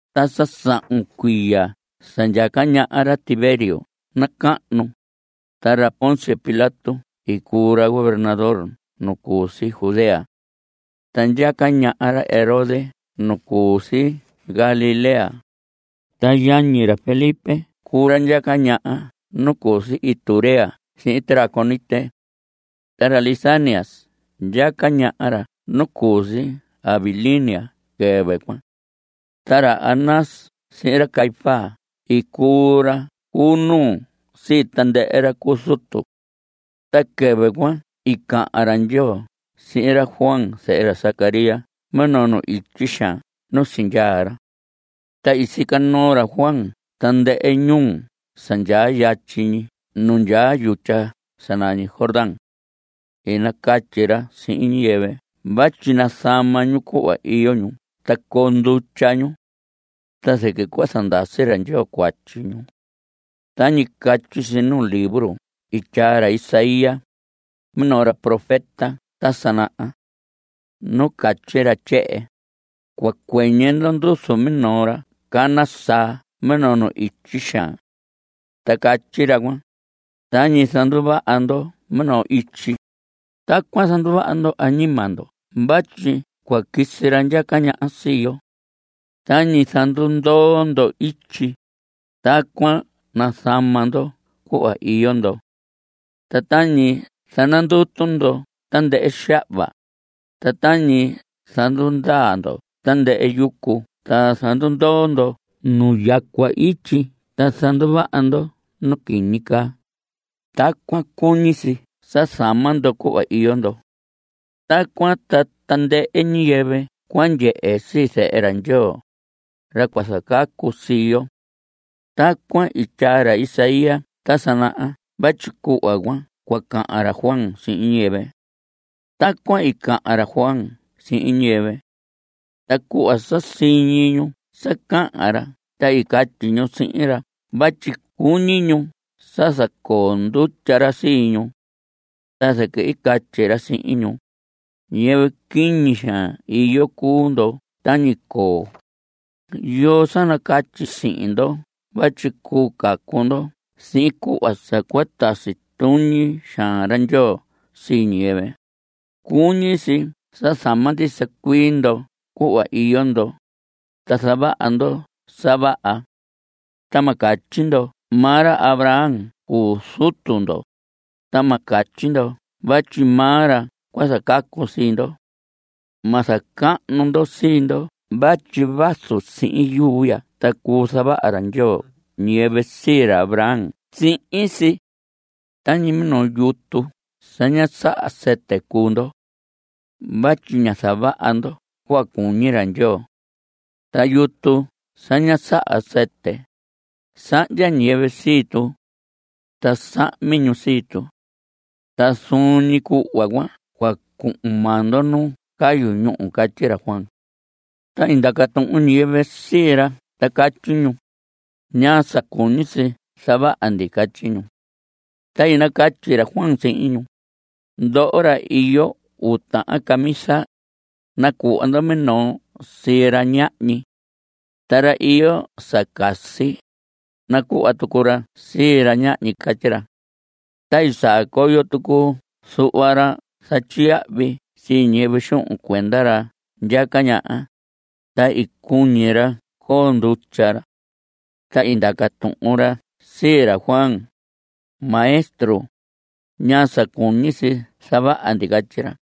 Ta sa sahun cuiya sa ndyaca ñaha ra Tiberio nacahnu, ta ra Poncio Pilato i cuu ra gobernador nu cu si Judea. Ta ndyaca ñaha ra Herodes nu cu si Galilea. Ta yañi ra, ra Felipe cuu ra ndyaca ñaha nu cu si Iturea sihin Traconite. Ta ra Lisanias ndyaca ñaha ra nu cu si Abilinia quɨvɨ cuan. Ta ra Anás sihin ra Caífas i cuu ra cu nuu sii tandɨhɨ ra cu zutu. Ta quɨvɨ cuan i cahan ra Ndyoo sihin ra Juan zehe ra Zacarías minoo nu ityi xaan nu sindyaa ra. Ta i sica noo ra Juan tandɨhɨ ñuu sa ndyaa yatyi ñi nu ndyaa yutya sa nañi Jordán. I nacatyi ra sihin ñiyɨvɨ vatyi nazama ñu cuhva iyo ñu ta coo ndutya ñu. Ta zɨquɨ cua zandasi ra Ndyoo cuatyi ñu. Tañi catyi si nuu libro i tyaa ra Isaías, minoo ra profeta ta sa naha. Nu catyi ra tyehen: Cua cuɨñɨ ndo nduzu minoo ra cana saa minoo nu ityi xaan. Ta catyi ra cuan: “Tañi zanduvaha ndo minoo ityi, tacuan zanduvaha ndo añima ndo vatyi cua quisi ra ndyaca ñaha sii yo. Tañi zandundoo ndo ityi, tacuan nazama ndo cuhva iyo ndo. Ta tañi zanandutu ndo tandɨhɨ xahva, ta tañi zandundaa ndo tandɨhɨ yucu ta zandundoo ndo nu yacua ityi ta zanduvaha ndo nu quiñi caa, tacuan cuñi si sa zama ndo cuhva iyo ndo. Tacuan ta tandɨhɨ ñiyɨvɨ cua ndyehe sii Zehe ra Ndyoo, ra cua zacacu sii yo.” Tacuan i tyaa ra Isaías ta sa naha vatyi cuhva cuan cua cahan ra Juan sihin ñiyɨvɨ. Tacuan i cahan ra Juan sihin ñiyɨvɨ. Ta cuhva sa siñi ñu sa cahan ra ta i catyi ñu sihin ra vatyi cuñi ñu sa zacoo ndutya ra sii ñu. Ta zɨquɨ i catyi ra sihin ñu: ¡Ñiyɨvɨ quiñi xaan iyo cuu ndo tañi coo! ¿Yoo sa nacatyi sihin ndo vatyi cuu cacu ndo sihin cuhva sa cua tasi tuñi xaan ra Ndyoo sii ñiyɨvɨ? Cuñi si sa zama ndisa cuii ndo cuhva iyo ndo, ta zavaha ndo sa vaha. Ta ma catyi ndo vatyi maa ra Abraham cuu zutu ndo, ta ma catyi ndo vatyi maa ra cua zacacu sii ndo. Ma zacahnu ndo sii ndo vatyi vazu sihin yuu ya ta cuu zavaha ra Ndyoo ñiyɨvɨ sii ra Abraham sihin si. Tañi minoo yutu sa ña saha sɨtɨ cuu ndo. Vatyi ña zavaha ndo cuhva cuñi ra Ndyoo. Ta yutu sa ña saha sɨtɨ, sahndya ñiyɨvɨ sii tu. Ta sahmi ñu sii tu. Ta zuun ñi cuhva cuan cua cuhun maa ndo nu cayu ñúhu. Catyi ra Juan. Ta i ndaca tuhun ñiyɨvɨ sii ra ta catyi ñu: ¿Ñaa sa cuñi si zavaha ndi? Catyi ñu. Ta i nacatyi ra Juan sihin ñu: Ndoho ra iyo uu tahan camisa, nacuhva ndo minoo sii ra ñahñi. Ta ra iyo sa casi, nacuhva tucu ra sii ra ñahñi. Catyi ra. Ta i saa coyo tucu zuhva ra zatyiyahvi sii ñiyɨvɨ xuhun cuenda ra ndyaca ñaha, ta i cuñi ra coo ndutya ra. Ta i ndaca tuhun ra sii ra Juan: Maestro, ¿ñaa sa cuñi si zavaha ndi? Catyi ra.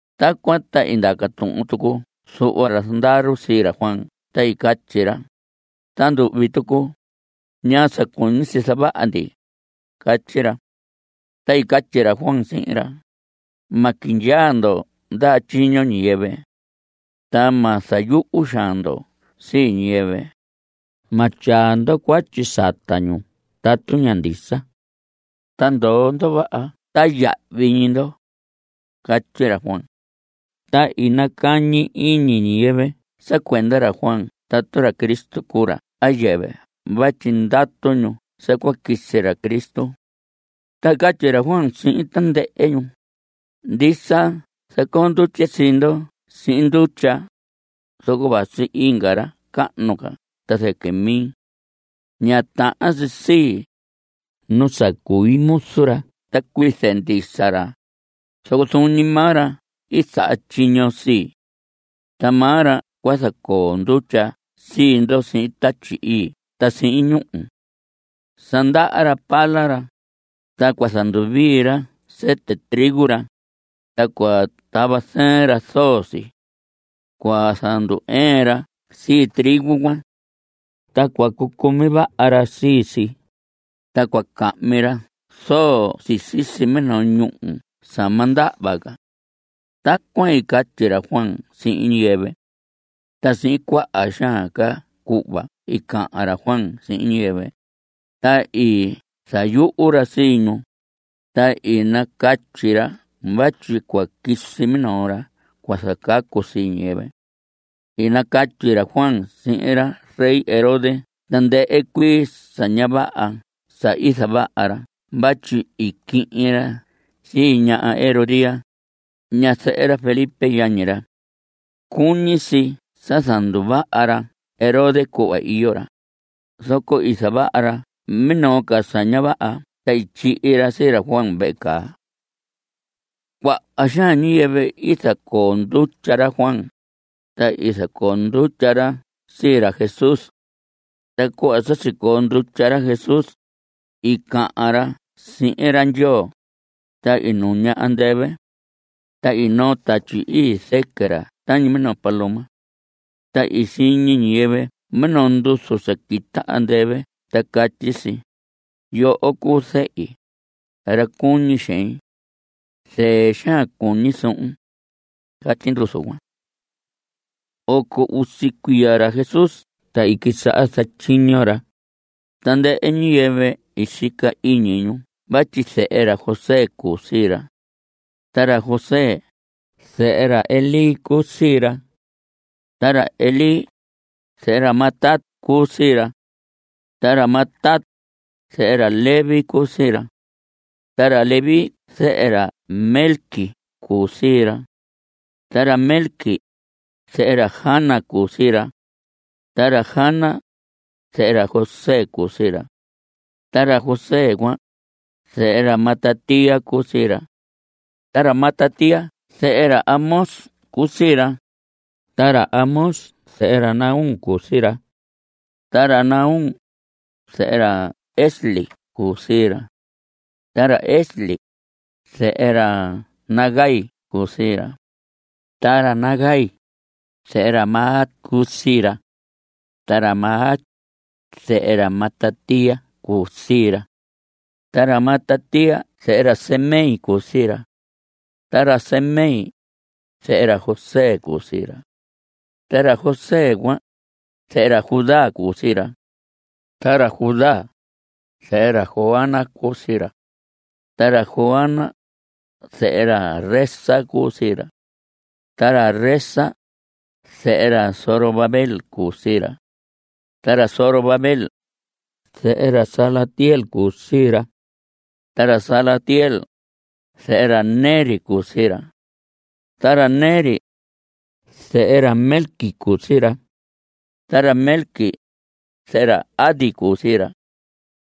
Tacuan ta i ndaca tuhun tucu zuhva ra zandaru sii ra Juan ta catyi ra: Ta nduhvi tucu, ¿ñaa sa cuñi si zavaha ndi? Catyi ra. Ta i catyi ra Juan sihin ra: Ma quindyaa ndo ndaha tyiño ñiyɨvɨ. Ta ma zayuhu xaan ndo sii ñiyɨvɨ. Ma tyaa ndo cuatyi sata ñu tatu ña ndisa. Ta ndoo ndo vaha ta yahvi ñi ndo. Catyi ra Juan. Ta i nacañi iñi ñiyɨvɨ sa cuenda ra Juan tatu ra Cristo cuu ra a yɨvɨ vatyi ndatu ñu sa cua quisi ra Cristo. Ta i catyi ra Juan sihin tandɨhɨ ñu: Ndisa zacoo ndutye sii ndo sihin ndutya, zoco vasi inga ra cahnu ca ta zɨquɨ mi. Ña tahan si sii, nu sa cui muzu ra ta cuize ndisa ra, zoco zuun ñi maa ra i saha tyiño sii. Ta maa ra cua zacoo ndutya sii ndo sihin Tatyi Ii ta sihin ñúhu. Sa ndaha ra pala ra, ta cua zanduvii ra sɨtɨ trigo ra, ta cua tava zɨɨn ra zoo si. Cua zandu‑ɨɨn ra sii trigo cuan, ta cua cucumi vaha ra sii si, ta cua cahmi ra zoo si sisi minoo ñúhu sa ma ndahva ca. Tacuan i catyi ra Juan sihin ñiyɨvɨ. Ta sihin cuaha xaan ca cuhva i cahan ra Juan sihin ñiyɨvɨ, ta i zayuhu ra sii ñu, ta i nacatyi ra vatyi cua quisi minoo ra cua zacacu sii ñiyɨvɨ. I nacatyi ra Juan sihin ra rey Herodes tandɨhɨ cuii sa ña vaha sa i zavaha ra vatyi i quihin ra sii ña Herodías, ñazɨhɨ ra Felipe yañi ra. Cuñi si sa zanduvaha ra Herodes cuhva iyo ra, zoco i zavaha ra minoo ca sa ña vaha ta i tyihi ra sii ra Juan vehe caa. Cuaha xaan ñiyɨvɨ i zacoo ndutya ra Juan, ta i zacoo ndutya ra sii ra Jesús. Ta cuhva sa sicoo ndutya ra Jesús, i cahan ra sihin ra Ndyoo, ta i nuña andɨvɨ. Ta i noo Tatyi Ii zɨquɨ ra tañi minoo paloma. Ta i siñi ñiyɨvɨ minoo nduzu sa quita andɨvɨ ta catyi si: Yoho cuu zehi, ra cuñi xein. Zɨɨ xaan cuñi suhun. Catyi nduzu cuan. Oco usi cuiya ra Jesús ta i quisaha zatyiño ra. Tandɨhɨ ñiyɨvɨ i sica iñi ñu vatyi zehe ra José cuu sii ra. Ta ra José, zehe ra Elí cuu sii ra. Ta ra Elí, zehe ra Matat cuu sii ra. Ta ra Matat, zehe ra Leví cuu sii ra. Ta ra Leví, zehe ra Melqui cuu sii ra. Ta ra Melqui, zehe ra Jana cuu sii ra. Ta ra Jana, zehe ra José cuu sii ra. Ta ra José cuan, zehe ra Matatías cuu sii ra. Ta ra Matatías, zehe ra Amós cuu sii ra. Ta ra Amós, zehe ra Nahum cuu sii ra. Ta ra Nahum, zehe ra Esli cuu sii ra. Ta ra Esli, zehe ra Nagai cuu sii ra. Ta ra Nagai, zehe ra Maat cuu sii ra. Ta ra Maat, zehe ra Matatías cuu sii ra. Ta ra Matatías, zehe ra Semei cuu sii ra. Ta ra Semei, zehe ra José cuu sii ra. Ta ra José cuan, zehe ra Judá cuu sii ra. Ta ra Judá, zehe ra Joana cuu sii ra. Ta ra Joana, zehe ra Resa cuu sii ra. Ta ra Resa, zehe ra Zorobabel cuu sii ra. Ta ra Zorobabel, zehe ra Salatiel cuu sii ra. Ta ra Salatiel, zehe ra Neri cuu sii ra. Ta ra Neri, zehe ra Melqui cuu sii ra. Ta ra Melqui, zehe ra Adi cuu sii ra.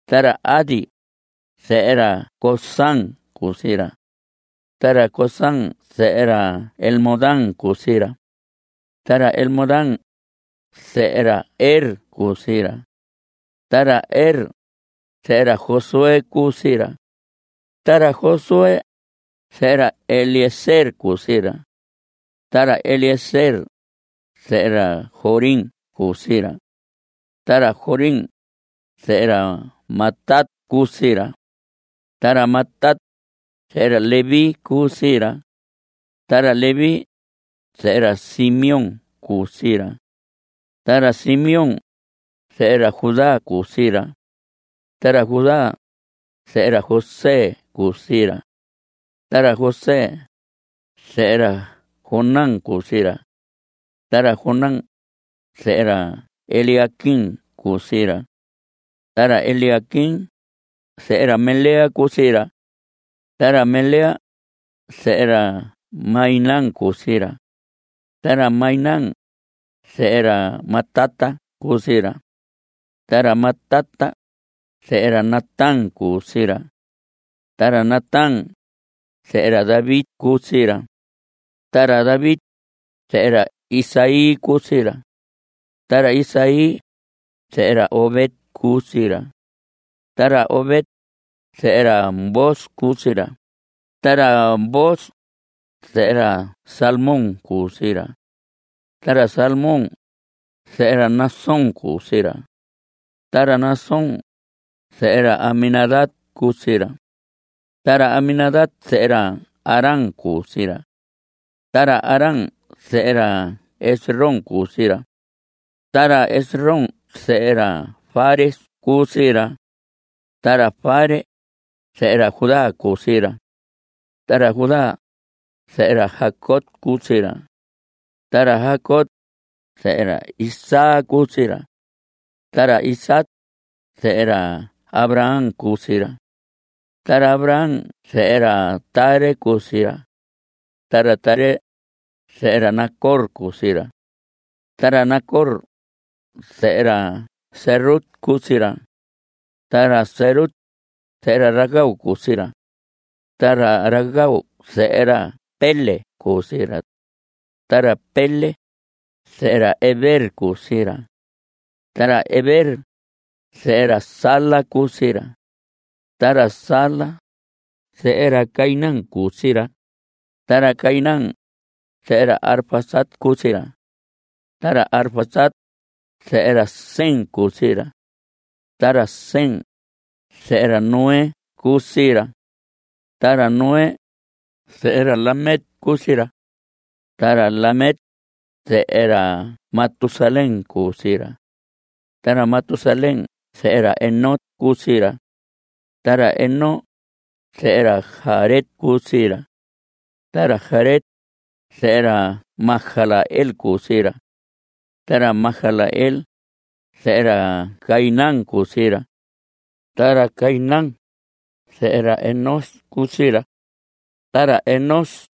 Ta ra Adi, zehe ra Cosam cuu sii ra. Ta ra Cosam, zehe ra Elmodam cuu sii ra. Ta ra Elmodam, zehe ra Er cuu sii ra. Ta ra Er, zehe ra Josué cuu sii ra. Ta ra Josué, zehe ra Eliezer cuu sii ra. Ta ra Eliezer, zehe ra Jorim cuu sii ra. Ta ra Jorim, zehe ra Matat cuu sii ra. Ta ra Matat, zehe ra Leví cuu sii ra. Ta ra Leví, zehe ra Simeón cuu sii ra. Ta ra Simeón, zehe ra Judá cuu sii ra. Ta ra Judá, zehe ra José cuu sii ra. Ta ra José, zehe ra Jonán cuu sii ra. Ta ra Jonán, zehe ra Eliaquim cuu sii ra. Ta ra Eliaquim, zehe ra Melea cuu sii ra. Ta ra Melea, zehe ra Mainán cuu sii ra. Ta ra Mainán, zehe ra Matata cuu sii ra. Ta ra Matata, zehe ra Natán cuu sii ra. Ta ra Natán, zehe ra David cuu sii ra. Ta ra David, zehe ra Isaí cuu sii ra. Ta ra Isaí, zehe ra Obed cuu sii ra. Ta ra Obed, zehe ra Booz cuu sii ra. Ta ra Booz, zehe ra Salmón cuu sii ra. Ta ra Salmón, zehe ra Naasón cuu sii ra. Ta ra Naasón, zehe ra Aminadab cuu sii ra. Ta ra Aminadab, zehe ra Aram cuu sii ra. Ta ra Aram, zehe ra Esrom cuu sii ra. Ta ra Esrom, zehe ra Fares cuu sii ra. Ta ra Fares, zehe ra Judá cuu sii ra. Ta ra Judá, zehe ra Jacob cuu sii ra. Ta ra Jacob, zehe ra Isaac cuu sii ra. Ta ra Isaac, zehe ra Abraham cuu sii ra. Ta ra Abraham, zehe ra Taré cuu sii ra. Ta ra Taré, zehe ra Nacor cuu sii ra. Ta ra Nacor, zehe ra Serug cuu sii ra. Ta ra Serug, zehe ra Ragau cuu sii ra. Ta ra Ragau, zehe ra Peleg cuu sii ra. Ta ra Peleg, zehe ra Heber cuu sii ra. Ta ra Heber, zehe ra Sala cuu sii ra. Ta ra Sala, zehe ra Cainán cuu sii ra. Ta ra Cainán, zehe ra Arfaxad cuu sii ra. Ta ra Arfaxad, zehe ra Sem cuu sii ra. Ta ra Sem, zehe ra Noé cuu sii ra. Ta ra Noé, zehe ra Lamec cuu sii ra. Ta ra Lamec, zehe ra Matusalén cuu sii ra. Ta ra Matusalén zehe ra Enoc cuu sii ra. Ta ra Enoc, zehe ra Jared cuu sii ra. Ta ra Jared, zehe ra Mahalaleel cuu sii ra. Ta ra Mahalaleel, zehe ra Cainán cuu sii ra. Ta ra Cainán, zehe ra Enós cuu sii ra. Ta ra Enós,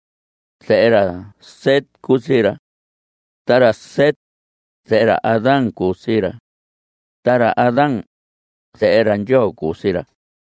zehe ra Set cuu sii ra. Ta ra Set, zehe ra Adán cuu sii ra. Ta ra Adán, zehe ra Ndyoo cuu sii ra.